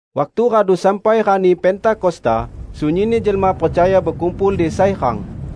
Waktu radu sampai rani Pentakosta, sunyinni jelma percaya bekumpul di sai rang.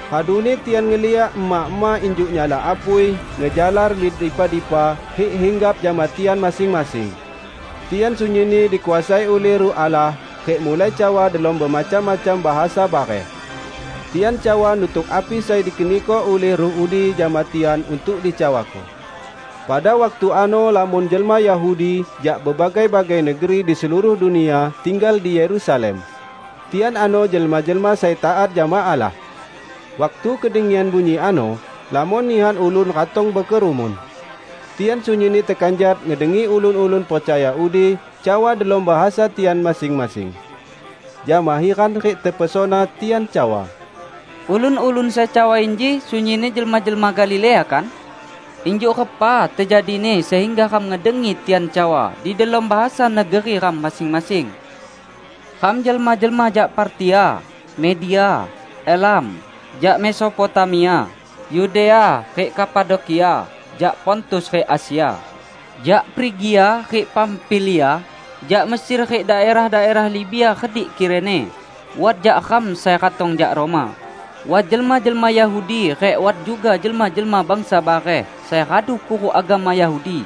Raduni tian ngeliak ema-ema injuk nyala apui ngejalar mik dipa-dipa rik hinggap jama tian masing-masing. Tian sunyinni dikuasai ulih Ruh Allah, rik mulai cawa delom bemacam-macam bahasa bareh. Tian cawa nutuk api sai dikeniko ulih Ruh udi jama tian untuk dicawako. Pada waktu ano lamon jelma Yahudi, jak bebagai-bagai negeri di seluruh dunia, tinggal di Yerusalem. Tian ano jelma-jelma sai taat jama Allah. Waktu kedengian bunyi ano, lamon nihan ulun ratong bekerumun. Tian sunyinni tekanjat ngedengi ulun-ulun percaya udi cawa delom bahasa tian masing-masing. Jama hiran rik tepesona tian cawa, "Ulun-ulun sai cawa inji sunyinni jelma-jelma Galilea, kan? Injuk repa tejadini sehingga ram ngedengi tian cawa di delom bahasa negeri ram masing-masing? Ram jelma-jelma jak Partia, Media, Elam; jak Mesopotamia, Yudea rik Kapadokia; jak Pontus rik Asia, jak Frigia rik Pamfilia, jak Mesir rik daerah-daerah Libia redik Kirene; wat jak ram sai ratong jak Roma, wat jelma-jelma Yahudi rik wat juga jelma-jelma bangsa bareh sai radu kuruk agama Yahudi;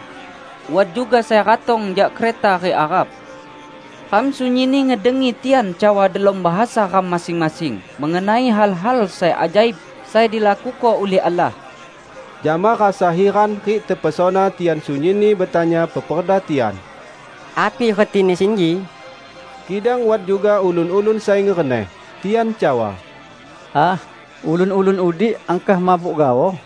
wat juga sai ratong jak Kreta rik Arab. Ram sunyinni ngedengi tian cawa delom bahasa ram masing-masing mengenai hal-hal sai ajaib sai dilakuko ulih Allah!" Jama rasa hiran rik tepesona tian sunyinni betanya peperda tian, "Api retini sinji?" Kidang wat juga ulun-ulun sai ngereneh. Tian cawa, "Ah, ulun-ulun udi angkah mabuk gaoh!"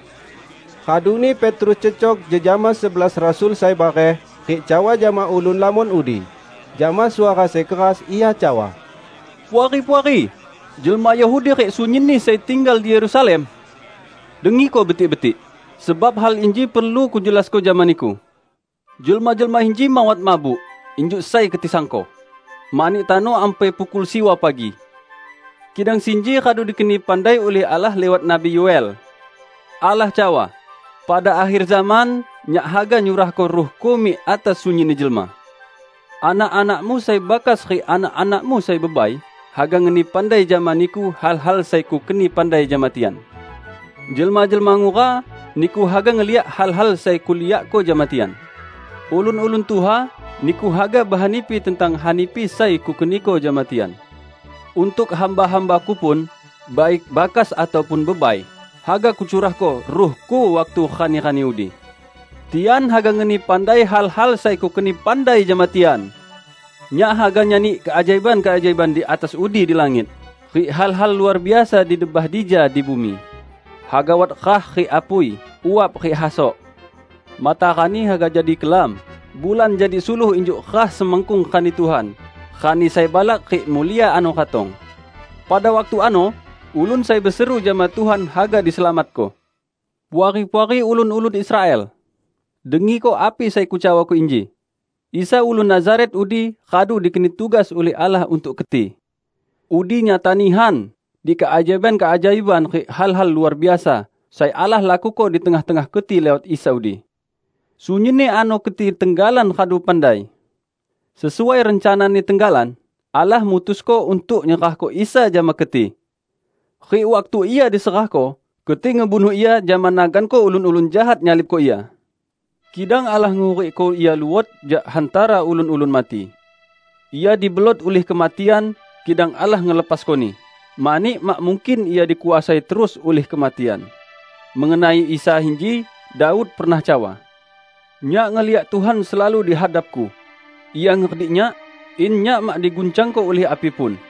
Raduni Petrus cecok jejama sebelas rasul sai bareh, rik cawa jama ulun lamon udi. Jama suara sai keras ia cawa, "Puari-puari, jelma Yahudi rik sunyinni sai tinggal di Yerusalem! Dengiko betik-betik, sebab hal inji perlu kujelasko jama niku. Jelma-jelma inji mawat mabuk, injuk sai keti sangko; mani tano ampai pukul siwa pagi. Kidang sinji radu dikeni pandai ulih Allah liwat Nabi Yo"el: Allah cawa, 'Pada akher zaman Nyak haga nyurahko Ruh-Ku mik atas sunyinni jelma. Anak-anakmu sai bakas rik anak-anakmu sai bebai haga ngeni pandai jama niku hal-hal sai Kukeni pandai jama tian. Jelma-jelma ngura niku haga ngeliak hal-hal sai Kuliakko jama tian. Ulun-ulun tuha niku haga behanipi tentang hanipi sai Kukeniko jama tian. Untuk hamba-hamba-Ku pun -- baik bakas ataupun bebai -- haga Kucurahko Ruh-Ku waktu rani-rani udi. Tian haga ngeni pandai hal-hal sai Kukeni pandai jama tian. Nyak haga nyani keajaiban-keajaiban di atas udi di langit, rik hal-hal luar biasa di debah dija di bumi; haga wat rah rik apui, uap rik hasok. Matarani haga jadi kelam, bulan jadi suluh injuk rah semakkung Rani Tuhan, rani sai balak rik mulia ano ratong. Pada waktu ano, ulun sai beseru jama Tuhan haga diselamatko.' Puari-puari ulun-ulun Israel! Dengiko api sai kucawako inji: Isa ulun Nazaret udi radu dikeni tugas ulih Allah untuk keti. Udi nyata nihan di keajaiban-keajaiban rik hal-hal luar biasa sai Allah lakuko di tengah-tengah keti liwat Isa udi. Sunyinni ano keti tenggalan radu pandai. Sesuai rencana-Ni tenggalan, Allah mutusko untuk nyerahko Isa jama keti. Rik waktu Ia diserahko, keti ngebunuh Ia jama naganko ulun-ulun jahat nyalibko Ia. Kidang Allah ngehurikko Ia luot jak hantara ulun-ulun mati. Ia dibelot ulih kematian, kidang Allah ngelepasko-Ni, mani mak mungkin Ia dikuasai terus ulih kematian. Mengenai Isa inji Daud pernah cawa, 'Nyak ngeliak Tuhan selalu di hadapku; Ia ngeredik nyak, in nyak mak diguncangko ulih api pun.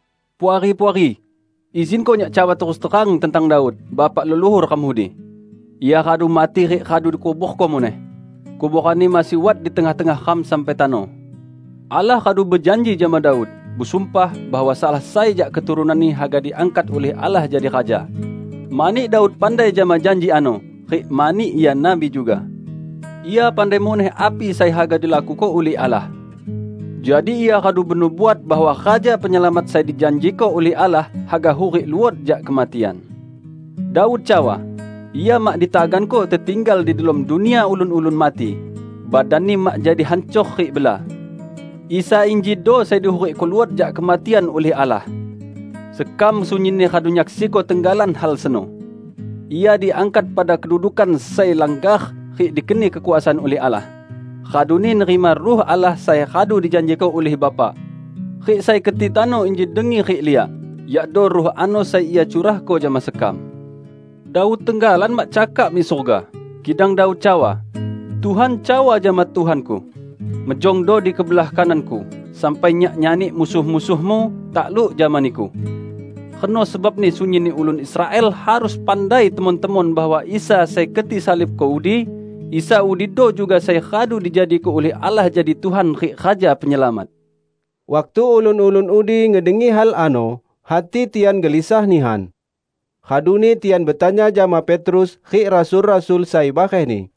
Puari-puari, izinko nyak cawa terus terang tentang Daud, bapak leluhur ram udi. Ia radu mati rik radu dikuborko muneh; kuboranni masih wat di tengah-tengah ram sampai tano. Allah radu bejanji jama Daud, busumpah, bahwa salah sai jak keturunanni haga diangkat ulih Allah jadi raja. Mani Daud pandai jama janji ano rik mani ia nabi juga, ia pandai muneh api sai haga dilakuko ulih Allah. Jadi ia radu benubuat bahwa Raja Penyelamat sai dijanjiko ulih Allah, haga hurik luot jak kematian. Daud cawa, 'Ia mak ditaganko tetinggal di delom dunia ulun-ulun mati; badan-Ni mak jadi hancor rik bela.' Isa injido sai dihurikko luot jak kematian ulih Allah. Sekam sunyinni radu nyaksiko tenggalan hal seno. Ia diangkat pada kedudukan sai langgar rik dikeni kekuasaan ulih Allah, raduni nerima Ruh Allah sai radu dijanjiko ulih Bapa. Rik sai keti tano inji dengi rik liak yakdo Ruh ano sai Ia curahko jama sekam. Daud tenggalan mak cakak mik surga, kidang Daud cawa, 'Tuhan cawa jama Tuhanku: Mejongdo di kebelah kanan-Ku, sampai Nyak nyani musuh-musuh-Mu takluk jama Niku!' Reno sebabni sunyinni ulun Israel harus pandai temon-temon bahwa Isa sai keti salibko udi, Isa udido juga sai radu dijadiko ulih Allah jadi Tuhan rik Raja Penyelamat!" Waktu ulun-ulun udi ngedengi hal ano, hati tian gelisah nihan. Raduni tian betanya jama Petrus rik rasul-rasul sai barehni,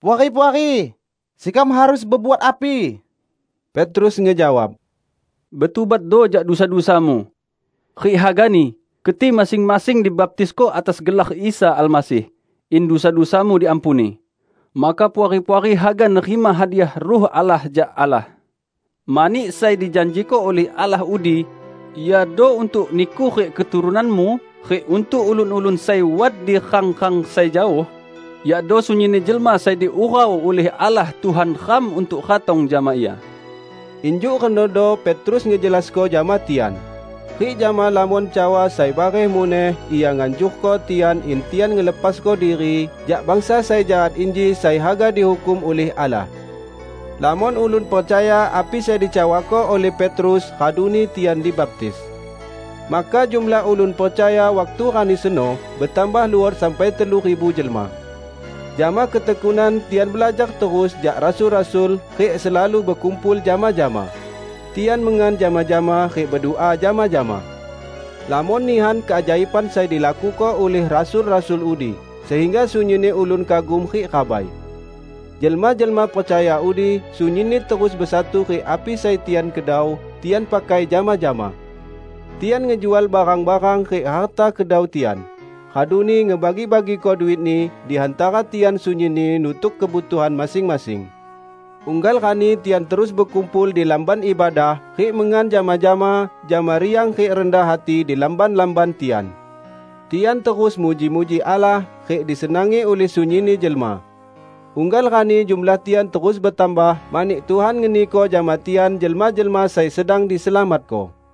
"Puari-puari, sekam harus bebuat api?" Petrus ngejawab, "Betubatdo jak dusa-dusamu. Rik hagani keti masing-masing dibaptisko atas gelar Isa Almasih, in dusa-dusamu diampuni. Maka Puari-puari haga nerima hadiah Ruh Allah jak Allah. Mani sai dijanjiko ulih Allah udi iado untuk niku rik keturunanmu rik untuk ulun-ulun sai wat di rang-rang sai jaoh -- yakdo sunyinni jelma sai diurau ulih Allah Tuhan ram untuk ratong jama Ia." Injuk renodo Petrus ngejelasko jama tian. Rik jama lamon cawa sai bareh muneh ia nganjurko tian in tian ngelepasko diri jak bangsa sai jahat inji sai haga dihukum ulih Allah. Lamon ulun percaya api sai dicawako ulih Petrus, raduni tian dibaptis. Maka jumlah ulun percaya waktu rani seno betambah luot sampai telu ribu jelma. Jama ketekunan tian belajar terus jak rasul-rasul rik selalu bekumpul jama-jama. Tian mengan jama-jama rik bedua jama-jama. Lamon nihan keajaiban sai dilakuko ulih rasul-rasul udi sehingga sunyinni ulun kagum rik rabai. Jelma-jelma percaya udi sunyinni terus besatu rik api sai tian kedau, tian pakai jama-jama. Tian ngejual barang-barang rik harta kedau tian, raduni ngebagi-bagiko duitni di hantara tian sunyinni nutuk kebutuhan masing-masing. Unggal rani tian terus bekumpul di Lamban Ibadah; rik mengan jama-jama, jama riang rik rendah hati di lamban-lamban tian. Tian terus muji-muji Allah rik disenangi ulih sunyinni jelma. Unggal rani jumlah tian terus betambah mani Tuhan ngeniko jama tian jelma-jelma sai sedang diselamatko.